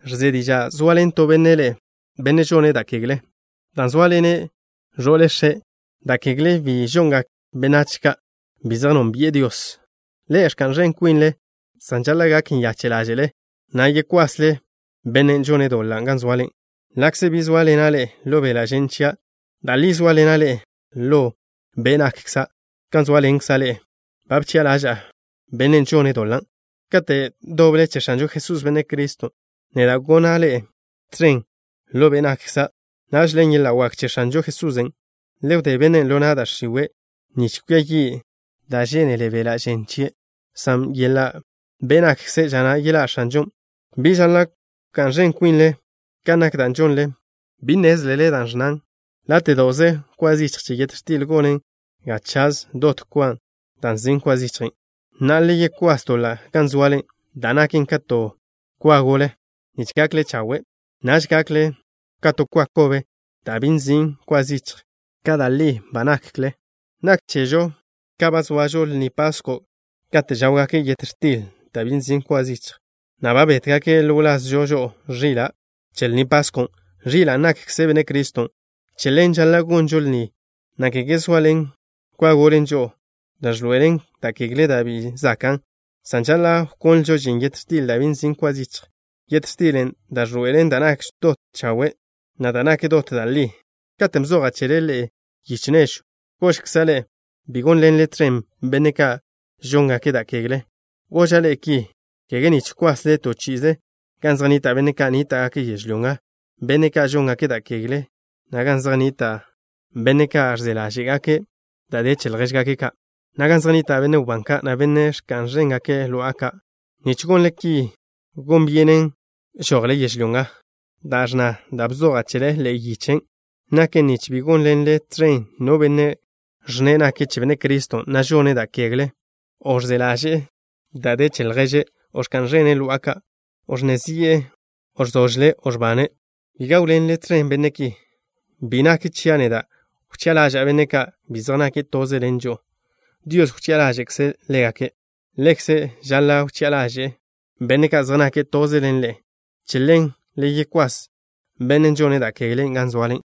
Ẕze diža' zoaḻen to benne' ḻe'e, benne' žone' da' kegle, dan' zóaḻene' ẕo'le x̱e'. Da' kegle ki bi žongak benách ka' bi zej nónbi'e Dios. Ḻe'e ẕka'n ẕen kwinle, san žaḻa' gak nyache' ḻáže'le, na' yekwasle bennen' žone' doḻan' gan zoale. Ḻa'kze bi zóaḻena' ḻe'e ḻo beḻa' žen chia', da' li zóaḻena' ḻe'e ḻo be' nakkza'. Kan zóaḻenkza' ḻe'e ba bchi'a ḻaža'a bennen' žone' doḻan'. Kate' doble che X̱anžo Jesús, Benne' Criston', neda' gona' ḻe'e tẕen ḻo be' nakkza'. Naž, ḻen yeḻa' wak che X̱anžo Jesusen', le wdé bennen' ḻo na' da' x̱iwe' nich kwia yi' da' žénele beḻa' žen chie', san yelá be' nakkze' ža na' yeḻá' X̱anžon'. Bi žaḻa' wká'n ẕen kwinle kan nak da' žonle. ¿Bi nnézlele da' ẕnnan: “Láte'do'ze kwa zichj che yet x̱til gonen ga chaž dot kwa da' nzin' kwa zichjen'?” Na'a, le yekwás doḻan' gan zoale da' naken ka to kwa gole, nich gakle chawe'. Naž gakle ka to kwa kobe da' bi nzin' kwa zichj, kan da' li ba nakle. Nak chežo ka ba zoažo Lni Pasko' kate' žáwgake' yet x̱til da' bi nzin' kwa zichj, na' ba bétgake' ḻo wlazžo žo'o ẕila' che Lni Paskon', ẕilan' nakkze Benne' Criston'. Che ḻen žaḻa' gonžo lni na', kege zoaḻen kwa gole žo'o, da' ẕḻoe'elen da' kegle da' bi zakan', san žaḻa' wkonlžo žin yet x̱til da' bi nzin' kwa zichj, yet x̱tilen' da' ẕḻoe'elen da' nak dot chawe', na' da' nak dot da' li. Katen' bzoja' chele ḻe'e yiche nežwn', gožkza' ḻe'e bi gónḻenle tẕen benne' ka' žóngake' da' kegle. Goža' ḻe'e ki, kege nich kwasle to chi'ize gan zej nnita' benne' ka' nníta'gake' yežlyó nga, benne' ka' žóngake' da' kegle, na' gan zej nnita' benne' ka' ẕze ḻáže'gake' da' de che ljéžgake' ka', na' gan zej nnita' benne' wbán ka', na' benne' ka' ẕka'n ẕéngake' lo'a ka'. Nich gonle ki gon byenen žojle yežlyó nga. Da' ẕnna da' bzoja' chele, ḻe'e yichen', naken nich bi gónḻenle tẕen no benne' ẕnne' nake' che Benne' Criston', san žone' da' kegle, o ẕze ḻaže'e da' de che lježe', o ẕka'n ẕene' lo'a ka', o ẕnne zi'e, o ẕzožle', o ẕbane'. Bi gáwḻenle tẕen benne' ki. Bi nak chia' neda' wchi'a ḻaža'a benne' ka' bi zej nake' toze ḻen žo'o. Dios wchi'a ḻaže'e ḻégake'. Ḻe'ekze žaḻa' wchi'a ḻáže'le benne' ka' zej nake' toze ḻen ḻe'e. Che ḻen, le yekwás bennen' žone' da' keglen' gan zoale.